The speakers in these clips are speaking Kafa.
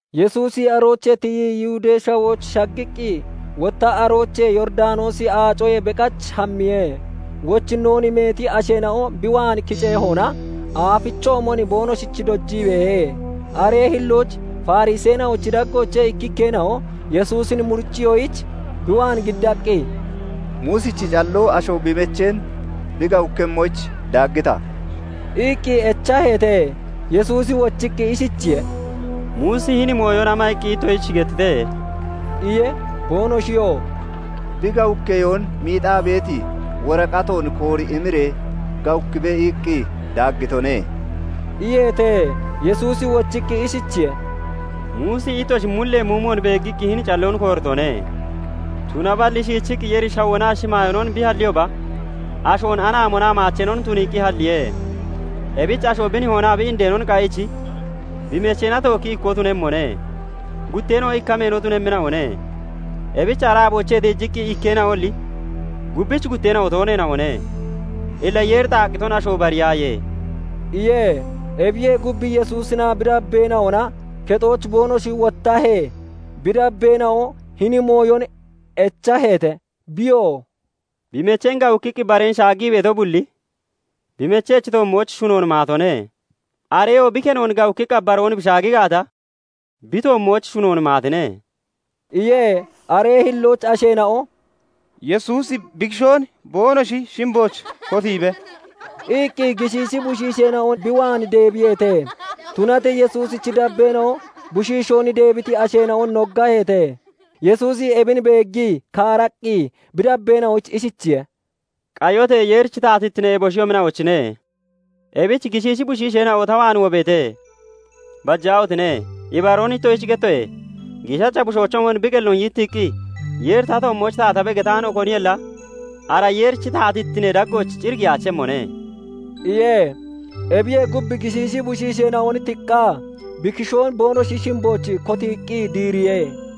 Yesuusi aroochee tiyii Yihudee Shawooch shaggiqqi, wotta aroochee Yooridanoosi Aacoyee beqach hammiye. Wochinnoon meeti asheena'o bi waan kiceehona aafichoomon boonoshich dojii beehe. Aree hillooch Fariseena'ochi daggoochee ikkikkeena'o Yesuusin muriciyoyich bi waan giddaqqi, "Muusichi calloo asho bi mecheen bi gawukkemmoyich daaggita?" iqqi echaheete. Yesuusi wochiqqi ishichiye:- "Muusi hini mooyon ama iqqi ittoshich gettite?" iye. Boonoshiyoo " 'Bi gawukkeyoon miixaa beeti woraqatoon koori imiree gawukkibe' iqqi daaggitone" iyeete. Yesuusi wochiqqi ishichiye:- "Muusi ittoshi mullee muumon beeggiqqi hini calloon kooritone. Tunaballi shiichiqqi Yeeri shawoonaa shimaayoonon bi halliyooba, ashoon anaamoonaa maacheenon tuniiqqi halliye. 'Ebich asho bi nihoonaa bi indeenon qayiich bi mecheena tookki ikkoo tuemmone. Gutteena'oo ikka meeno tunemmina'one. Ebich ara aaboochee tiijiqqi ikkeena'oalli gubbich gutteena'o tooneena'one. Illa Yeeri xaaqqiton asho bariyaaye" iye. Ebiyee gub, Yesuusinaa bi dabbeena'oona kexooch boonoshi wottahee, bi dabbeena'o hini mooyon echaheete. Biyoo "Bi mecheen gawukkiqqi bareen shaaggii beeto bulli bi mechechi toommooch shunoon maatone. Areyoo bi kenoon gawukkiqqa baroon bi shaagi gaata, bi toommooch shunoon maatine" iye. Aree hillooch asheena'o "Yesuusi bi kishoon boonoshi shimbooch kotiibe" iqqi gishiishi bushiisheena'on bi waan deebiyeete. Tunatee Yesuusichi dabbeena'o bushiishoon deebiti asheena'on noggaheete. Yesuusi ebin beeggii kaaraqqi bi dabbeena'oyich ishichiye:- "Qayote! Yeerichi taatittine eboshiyoomina'ochine. Ebich gishiishi bushiisheena'o ta waan wobeete. Bajaahotine! Ibaroon ittoshich gettoye; giishacha bushoochoomon bi qelloon yittiiqqi, 'Yeeri ta toommooch taatabe' getaano koniyolla ara Yeerichi taatittinee daggooch cir giyaachemmone" iye. Ebiyee gub, gishiishi bushiisheena'on tiqqaa bi kishoon boonoshi shimbooch kotiiqqi diiriye.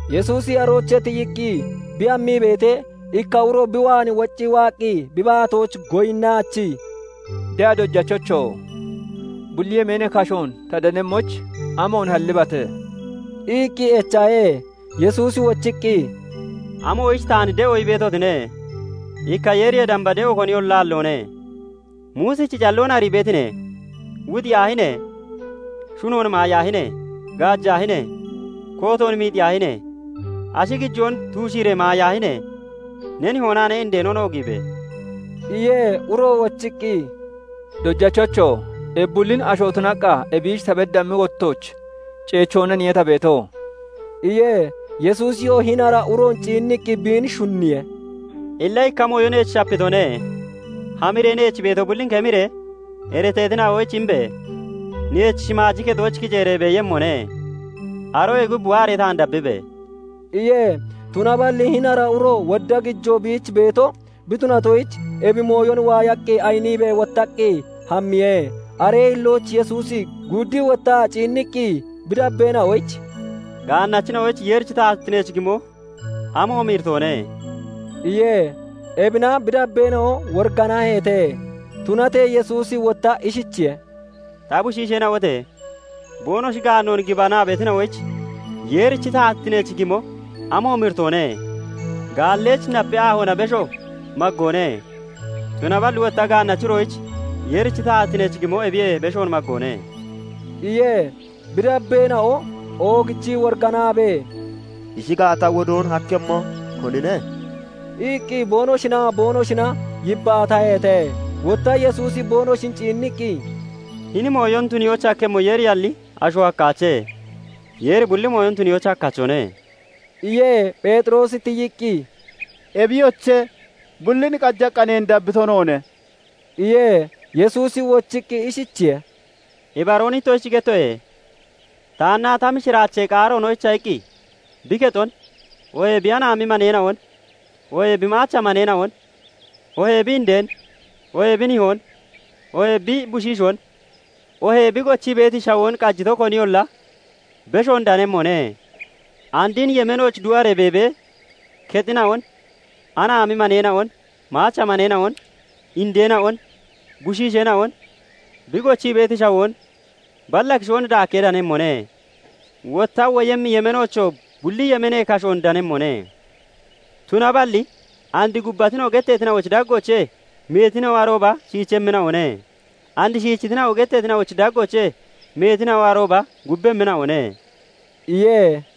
Yesuusi aroochee tiyiqqi bi hammii beetee, ikka uro bi waan woccii waaqqi bi baatooch goyinnaachii, "De'a Dojachocho! Bulli yemeenee kashoon ta danemmoyich amoon hallibate?" iqqi echahe. Yesuusi wochiqqi, "Amoyich taan de'o ii beetine? Ikka Yeeriyee damba de'o koniyolla aalloone. Muusichi calloon arii beetine; 'Wuxiyaahine! Shunoon maayaahine! Gaajaahine! Kootoon miixiyaahine! Ashi gijoon tuushiiree maayaahine! Ne nihoonaa ne indeenon oogiibe!' "iye. Uroo wochiqqi, "Dojachocho! Ebi bullin asho tunaqqa ebiich ta beddammi wottooch ceechoonaniye ta beeto" iye. Yesuusiyoo hini ara uroon ciinniqqi biin shunniye. "Illa ikka mooyo neech shapitone; hamiree neech beeto bullin kemiree iriteetina'oyich imbe! Neech shimaaji kexooch kiceeree beeyemmone. Aroyee gub waaree taan dabbibe!" iye. Tunaballi hini ara uro wodda gijoo biich beeto bi tunatoyich, ebi mooyon waayaqqi ayiniibee wottaqqi hammiye. Aree hillooch Yesuusi guuddii wottaa ciinniqqi bi dabbeena'oyich "Gaannachina'oyich Yeerichi taatittineech gimo amoomi iritoone!" iye. Ebina bi dabbeena'o woriganaheete. Tunatee Yesuusi wotta ishichiye:- "Ta bushiisheena'ote! [Boonoshi gaannoon gibanaa beetina'oyich] Yeerichi taatittineech gimo amoomi iritoone! Gaalleyich napee aahoona besho maggoone; tunaballi wotta gaannachi uroyich Yeerichi taatittineech gimo ebiyee beshoon maggoone" iye. Bi dabbeena'o oogichii woriganaabee, "Ishi gaata, wodoon hakkemmo konine?" iqqi boonoshinaa boonoshina yibbaataheete. Wotta Yesuusi boonoshin ciinniqqi, "Hini mooyon tuniyoyich hakkemmo Yeeriyalli asho hakkaache. Yeeri bulli mooyon tuniyoyich hakkachone" iye. Pheexiroosi tiyiqqi, "Ebiyoche! Bullin qajaqqa neen dabbito noone" iye. Yesuusi wochiqqi ishichiye:- "Ibaroon ittoshich gettoye; taannaa ta mishiraachee qaaroonoyicha iqqi bi kexon, oohee bi anaami maneena'on, oohee bi maacha maneena'on, oohee bi indeen, oohee bi nihoon, oohee bi bushiishoon, oohee bi gochii beeti shawoon qajito koniyolla beshoon danemmone. And hini yemeenooch du'aree beebee, kexina'on, anaami maneena'on, maacha maneena'on, indeena'on, bushiisheena'on, bi gochii beeti shawoon balla kishoon daakkee danemmone; wotta woyemmi yemeenoochoo bulli yemeenee kashoon danemmone. Tunaballi and 'Gubbatina'o' getteetina'ochi daggoochee meetina'o arooba shiichemmina'one; and 'Shiichitina'o' getteetina'ochi daggoochee meetina'o arooba gubbemmina'one" iye.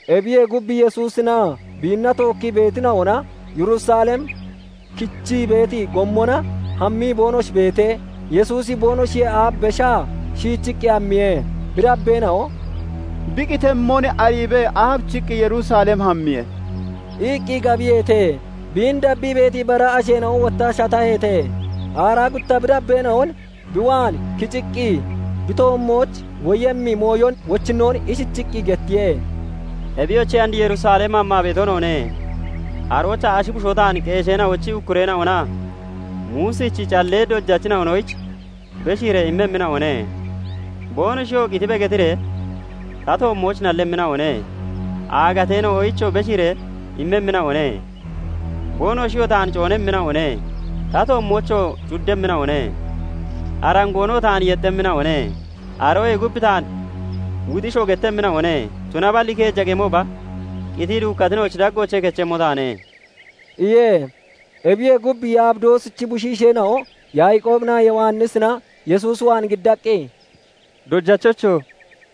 Ebiyee gub, Yesuusinaa biinna tookkii beetina'ona Yerusalem kichii beeti gommona hammii boonoshi beetee, Yesuusi boonoshiyee aaf beshaa shiichiqqi hammiye. Bi dabbeena'o "Bi qitemmon ariibee aabichiqqi Yerusalem hammiye?" iqqi gabiyeete. Biin dabbii beeti bara asheena'o wotta shataheete. Aaraa gutta bi dabbeena'on bi waan kiciqqi bi toommooch woyemmi mooyon wochinnoon ishichiqqi gettiye; "Ebiyoche! And Yerusalem hammaa beeto noone. Aroochaa ashi bushoo taan qeesheena'ochi ukkureena'onaa Muusichi callee dojachina'onoyich beshiiree immemmina'one. Boonoshiyoo 'Qitibe' getiree ta toommooch nallemmina'one; Aagateena'oyichoo beshiiree immemmina'one. Boonoshiyoo taan coonemmina'one; ta toommoochoo cuddemmina'one; arangoonoo taan yexxemmina'one; aroyee gub taan wuxishoo gettemmina'one; tunaballi keeja qemooba qitii duukkatina'ochi daggoochee kechemmo taane" iye. Ebiyee gub, Yabidoosichi bushiisheena'o Yaaqoobinaa Yowannisina Yesuus waan giddaqqi, "Dojachocho!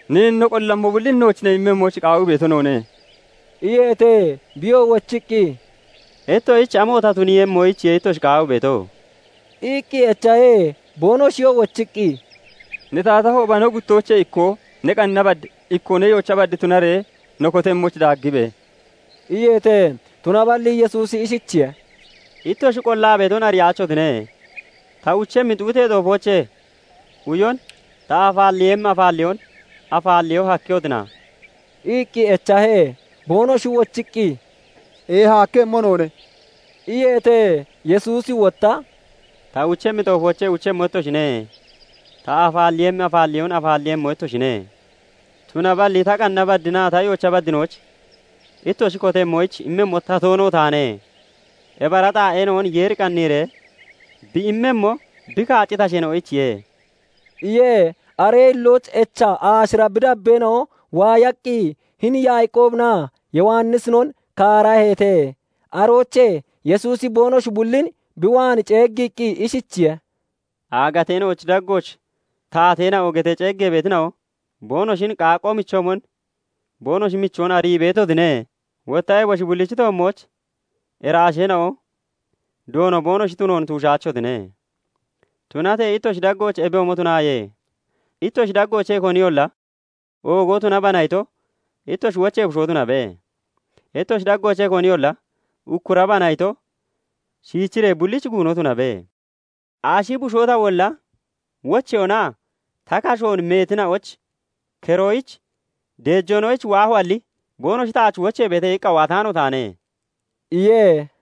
Neen no qollammo bullin nooch ne tuniiyemmoyich qaawii beeto noone" iyeete. Biyoo wochiqqi, "Ittoshich amo ta tuniiyemmoyichiye ittoshi qaawii beeto?" iqqi echahe. Boonoshiyoo wochiqqi, "Ne taatahooba, no guttoochee ikkoo ne qanna bad, ikkoo ne yoocha bad tunaree no kotemmoyich daaggibe!" iyeete. Tunaballi Yesuusi ishichiye:- "Ittoshi qollaa beeton ariyaachotine. Ta uchemmi xuuxee xoofoochee uyon, ta afaalleeyemmi afaalleyoon afaalleyo hakkehotina?" iqqi echahe. Boonoshi wochiqqi, "Eeha hakkemmo noone" iyeete. Yesuusi wotta "Ta uchemmi xoofoochee uchemmo ittoshine; ta afaalleeyemmi afaalleyoon afaalleeyemmo ittoshine. Tunaballi ta qanna badinaa ta yoocha baddinooch ittoshi kotemmoyich immemmo ta toono taane. Ebi ara xaa'eena'on Yeeri qanniiree bi immemmo, bi kaacciti asheena'oyichiye" iye. Aree hillooch echa aashira bi dabbeena'o waayaqqi hini Yaaqoobinaa Yowannisinon kaaraheete. Aroochee Yesuusi boonoshi bullin bi waan ceeggiqqi ishichiye:- "Aagateena'ochi daggooch 'Taateena'o' getee ceeggee beetina'o, boonoshin qaaqqo michoomon boonoshi michoon arii beetotine; wotta eboshi bullich toommooch iraasheena'o doono boonoshi tunoon tuushaachotine. Tunatee ittoshi daggooch ebiyoomon tunaaye! Ittoshi daggoochee koniyolla 'Oogo tunabana' ito, ittoshi wochee bushoo tunabe. Ittoshi daggoochee koniyolla 'Ukkurabana' ito, shiichiree bullichi guuno tunabe. Ashi bushoo tawolla wocheyoonaa ta kashoon meetina'ochi keroyich deejoonoyich waahoalli, 'Boonoshi taach wocheebeete' iqqa waataano taane" iye.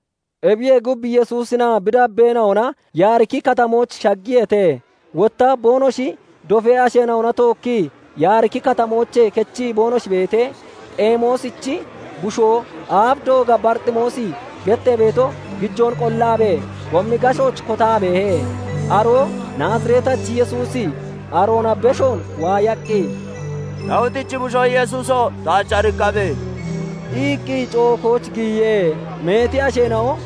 Ebiyee gub, Yesuusinaa bi dabbeena'ona Yaariki katamooch shaggiyeete. Wotta boonoshi dofee asheena'ona tookkii Yaariki Katamoochee kechii boonoshi beetee, Xemoosichi bushoo aaf dooga Barixemoosi gettee beeto, gijoon qollaabee gommi gashooch kotaa beehe. Aroo Naazireetachi Yesuusi aroona beshoon waayaqqi, "Daawitichi bushoo Yesuuso! Taach ariqqabe!" iqqi cookooch giyiye. Meeti asheena'o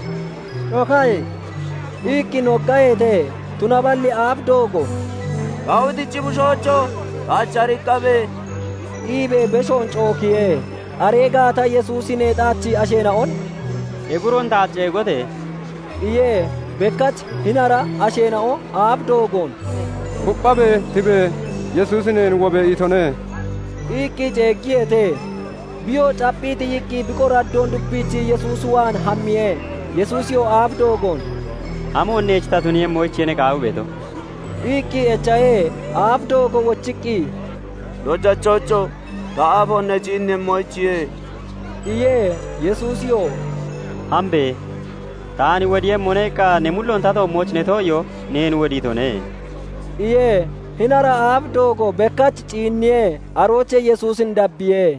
"Cookaaye!" iqqi noggaheete. Tunaballi aaf doogo "Daawitichi bushoocho! Taach ariqqabe!" iibee beshoon cookiye. Aree gaata Yesuusi neexaachii asheena'on "Ebi uroon taach ceegote!" iye. Bekkach hini ara asheena'o aaf doogoon "Kupphabe! Tibe! Yesuusi neen 'Wobe!' itone" iqqi ceeggiyeete. Biyoo capphii tiyiqqi bi qoraddoon dupiichii Yesuusi waan hammiye. Yesuusiyoo aaf doogoon "Amoon neech ta tuniiyemmoyichiye ne qaawii beeto?" iqqi echahe. Aaf doogo wochiqqi, "Dojachocho! Ta aafoon ne ciinniiyemmoyichiye!" iye. Yesuusiyoo "Hambe! 'Taan wodiiyemmone' iqqa ne mulloon ta toommooch ne too'iyoo neen wodiitone" iye. Hini ara aaf doogo bekkach ciinniye; aroochee Yesuusin dabbiye.